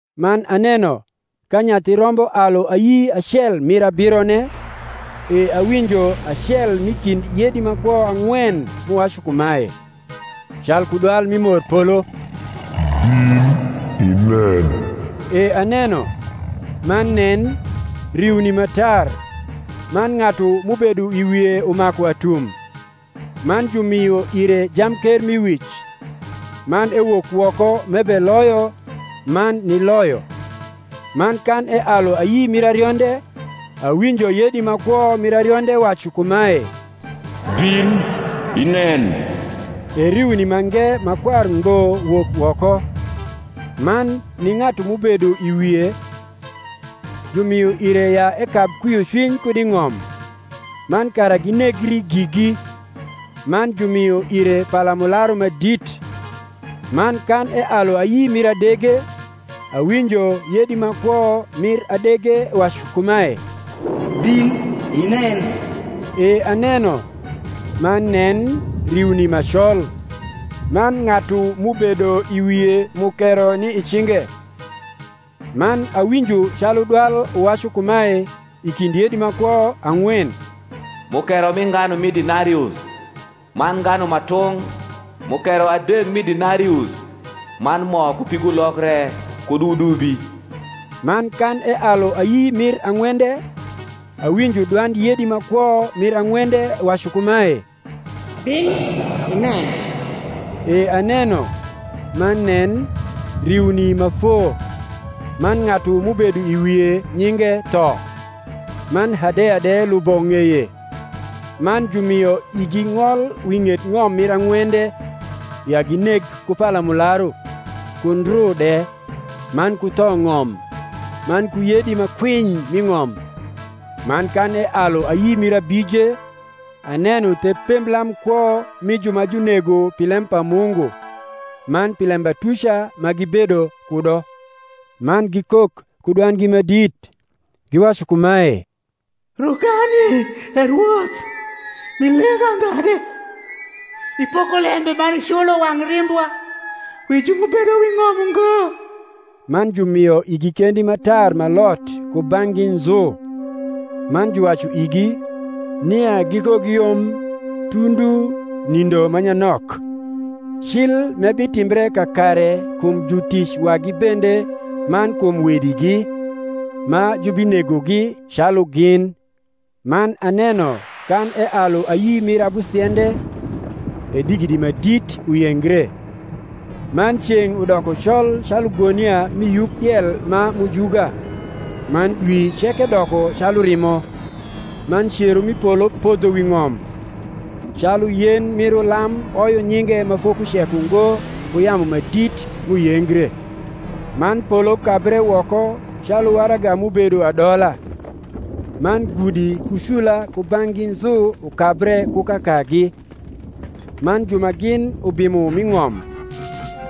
Man aneno ka Nyathi Rombo alu ayi acel mir abirone, e awinjo acel m’i kind yedi ma kwo ang’wen m’uwacu kumae, calku dwal mi morpolo, Bin inen. E aneno, man nen, riuni ma tar, man ng’atu m’ubedo i wie umaku atum; man jumio ire jamkermiwic: man ewok woko m’ebeloyo, man niloyo. Man kan ealu ayi mir arionde, awinjo yedi ma kwo mir arionde wacu kumae, Bin inen. E riuni mange ma kwar ngbo wok woko: man ni ng’atu m’ubedo i wie jumio ire ya ekab kwiocwiny kud i ng’om, man kara ginegri gigi: man jumio ire palamularu ma dit. Man kan ealu ayi mir adege, awinjo yedi ma kwo mir adege wacu kumae, Bin inen. E aneno, man nen, riuni ma col; man ng’atu m’ubedo i wie mukero ni i cinge. Man awinjo calu dwal uwacu kumae i kind yedi ma kwo ang’wen, Mukero mi nganu mi denarius, man nganu ma tung’ mukero adek mi denarius; man mo ku pigulok re kud wudubi. Man kan ealu ayi mir ang’wende, awinjo dwand yedi ma kwo mir ang’wende wacu kumae, Bin inen. E aneno, man nen, riuni ma foo: man ng’atu m’ubedo i wie, nyinge Tho; man Hadeya de lubo ng’eye. Man jumio igi ng’ol wi ng’et ng’om mir ang’wende, ya gineg ku palamularu, ku ndru de, man ku thong’om, man ku yedi ma kwiny m’i ng’om. Man kan ealu ayi mir abije, aneno the pemblam kwo mi ju ma junego pi lem pa Mungu, man pi lembatuca ma gibedo kudo: man gikok ku dwandgi ma dit, giwacu kumae, Rokani, E Rwoth, m’i leng’ andha de, ipoko lembe man iculo wang’ rimbwa wi ju m’ubedo wi ng’om ungo? Man jumio igi kendi ma tar ma lot kubang’gi nzu; man juwacu igi, nia gikogiyom tundu nindo ma nyanok, cil m’ebitimbre kakare kum jutic wagi bende man kum wedigi, ma jubinegogi calu gin. Man aneno kan ealu ayi mir abusiende, e digidi ma dit uyengre; man ceng’ udoko col calu gonia mi yuk diel ma mujuga, man dwi ceke doko calu rimo; man cero mi polo podho wi ng’om, calu yen mir ulam oyo nyinge ma fokucek ungo ku yamu ma dit m’uyengre. Man polo kabre woko calu waraga m’ubedo adola; man gudi ku cula kubang’gi nzu ukabre ku kakagi. Man ju ma gin ubimo m’i ng’om,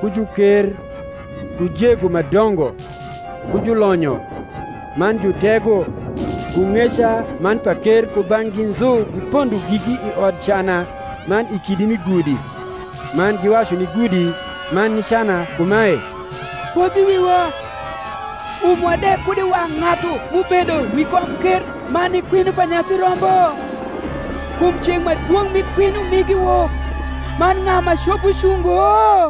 ku juker, ku jego ma dongo, ku julonyo, man jutego, ku ng’eca man paker kubang’gi nzu gipondo gigi i odcana man i kidi mi gudi; man giwacu ni gudi man ni cana kumae, Podh i wiwa, umwa de kud i wang’ ng’atu m’ubedo wi komker man ni kwinyo pa Nyathi Rombo: kum ceng’ ma dwong’ mi kwinyo migi wok; man ng’a ma copo cungo?